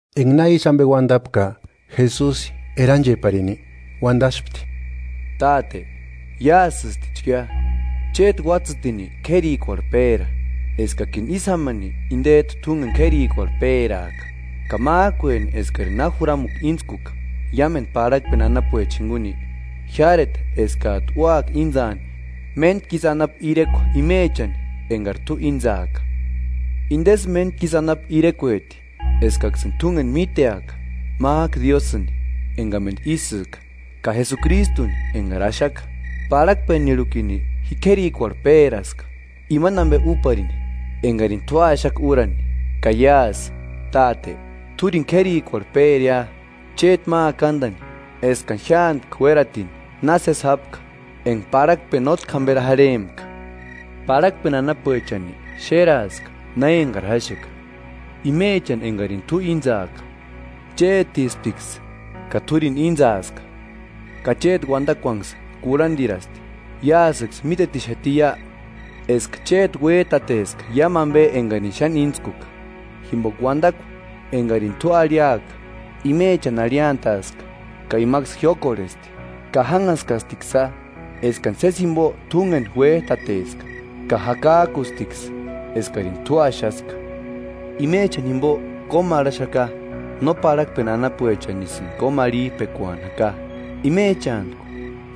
Enga na ísï ambe uandapka, Jesusi erancheparini uandaspti: “Táte iásïstichkia; chéti Uatsïtini k'érikuarhu péra, eskakini ísï jámani indejtu túngeni k'érikarhu péraaka. Ka májkueni eskari na juramukua íntskuka iámendu parhakpeni anapuechani jinguni, jiáreta eskajtu úaka intsaani méntku isï anapu irekua imechani engari t'u íntsaaka. Indesï méntkisï anapu irekueti: Eskaksïni t'úngeni míteaka, májku Diósïni engamendu ísïka, ka Jesukristuni engari axaka.” “Parhakpenirhukini ji k'érikuarhu péraska, imani ambe úparini engarini t'u axaka úrani. Ka iásï, Táte, t'úrini k'érikuarhu péria, chéti ma akandani eskani jiántki uératini na sési jápka enga parhakpeni nótki jamberi jarhempka.” “Parhakpeni anapuechani xéraaska na engari jáxeka, imechani engarini t'u íntsaaka. Chétisptiksï ka t'úrini íntsaaska; ka chéti Uandakuanksï kurhandirasti. Iásïksï mítetixatiia eska chéti uéjtateska iámu ambe engarini xáni íntskuka; jimboka uandakua engarini t'u arhiaka imechani arhiantaaska ka imaksï jiókorhesti ka jánhaskastiksïa eskani sési jimbo t'úngeni uéjtateska, ka jakajkustiksï eskarini t'u axaska. Imechani jimbo kómarhaxaka; no parhakpeni anapuechanisïni kómarhijpekuani jaka, imechantku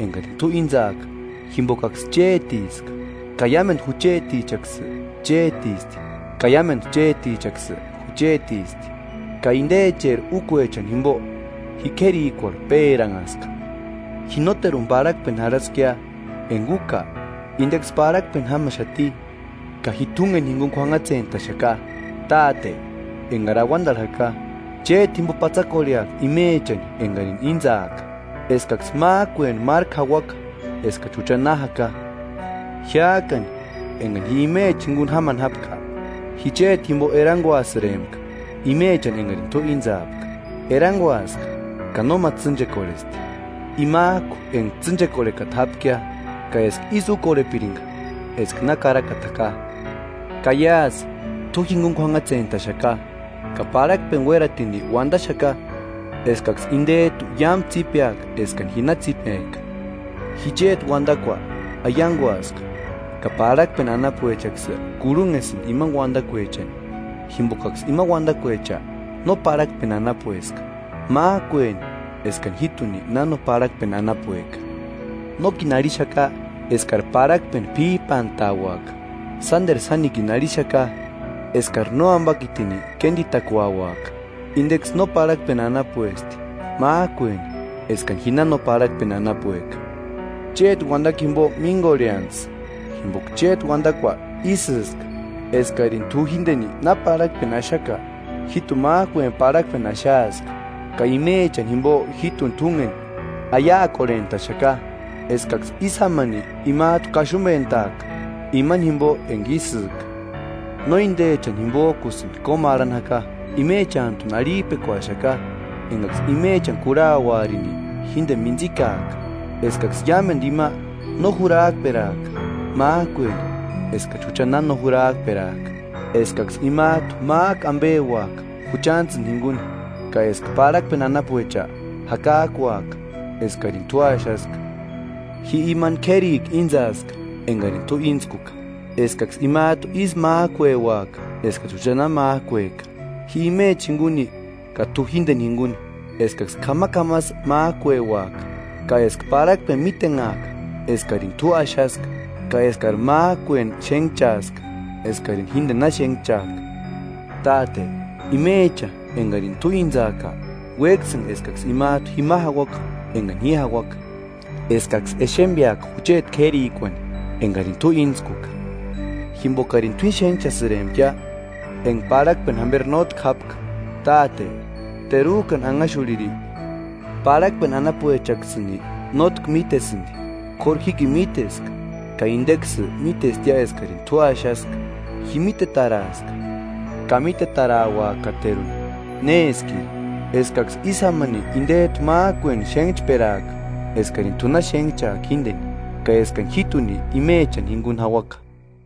engarini t'u íntsaaka, jimbokaksï chétiska; ka iámendu juchetichaksï chétisti ka iámendu chétichaksï juchetisti; ka indecheri úkuechani jimbo ji k'érikuarhu péranhaska.” “Ji nóteruni parhakpeni jarhaskia, enga úka indeksï parhakpeni jámaxati, ka ji t'úngeni jinguni k'uanhatsentaxaka. Táte engari auandarhu jaka, chéti jimbo patsakorhea imechani engarini íntsaaka, eskaksï májkueni márku jauaka eskachi jucha na jaka. Jiájkani engani ji imechani jinguni jámani jápka, ji chéti jimbo eranguasïrempka imechani engarini t'u íntsaapka. Eranguaska ka nóma tsînchekorhesti, imajku enga tsînchekorhekata japkia, ka eska ísï úkorhepiringa eska na karakata jaka.” “Ka iásï t'u jinguni k'uanhatsentaxaka, ka parhakpeni uératini uandaxaka eskaksï indejtu iámu tsípeaka eskani ji na tsípejka. Ji chéti Uandakua aianguaska, ka parhakpeni anapuechaksï kurhunhesïndi imani uandakuechani, jimbokaksï ima uandakuecha no parhakpeni anapueska, májkueni eskani jíjtuni na no parhakpeni anapueka. Nókini arhixaka eskari parhakpeni p'íjpantauaka, sánderu sánikini arhixaka eskari Nóambakitini kénditakuauaka. Indeksï no parhakpeni anapuesti, májkueni eskani ji na no parhakpeni anapueka. Chéti uandakua jimbo míngorheantsï; jimboka chéti uandakua ísïska. Eskarini t'u jíndeni na parhakpeni axaka, jíjtuni májkueni parhakpeni axaaska. Ka imechani jimbo jíjtuni t'úngeni aiakorhentaxaka, eskaksï ísï jámani imajtu kaxumbentaaka imani jimbo enga ísïka. No indechani jimbojkusïni kómarhani jaka, imechantuni arhijpekuaxaka engaksï imechani kurhauarini jíndeni míntsikaaka. Eskaksï iámendu ima no jurajkperaaka. Májkueni eskachi jucha na no jurhajperajka, eskaksï imajtu májku ambeuaka juchantsïni jinguni, ka eska parhakpeni anapuecha jakajkuaka eskarini t'u axaska. Ji imani k'érikua íntsaaska engarini t'u íntskuka, eskaksï imajtu ísï májkueuaka eskachi jucha na májkueka: Ji imechani jinguni ka t'u jíndeni jinguni, eskaksï k'amak'amasï májkueuaka, ka eska parhakpeni mítenhaaka eskarini t'u axaska ka eskari májkueni xénhchaaska eskarini jíndeni na xénhchajka.” “Táte, imecha engarini t'u íntsaaka, uéksïnga eskaksï imajtu jima jauaka engani ji jauaka, eskaksï exembeaka jucheti k'érikuani engarini t'u íntskuka, jimbokarini t'uíni xénhchasïrempkia enga parhakpeni jamberi nótki jápka. Táte terujkani anhaxurhiri, parhakpeni anapuechaksïni nótki mítesïndi, k'óru jíkini míteska ka indeksï mítestia eskarini t'u axaska. Ji mítetaraaska ka mítetarauakateruni néskiri, eskaksï ísï jámani indejtu májkueni xénhchperaka eskarini t'u na xénhchaka jíndeni, ka eskani jíjtuni imechani jinguni jauaka.”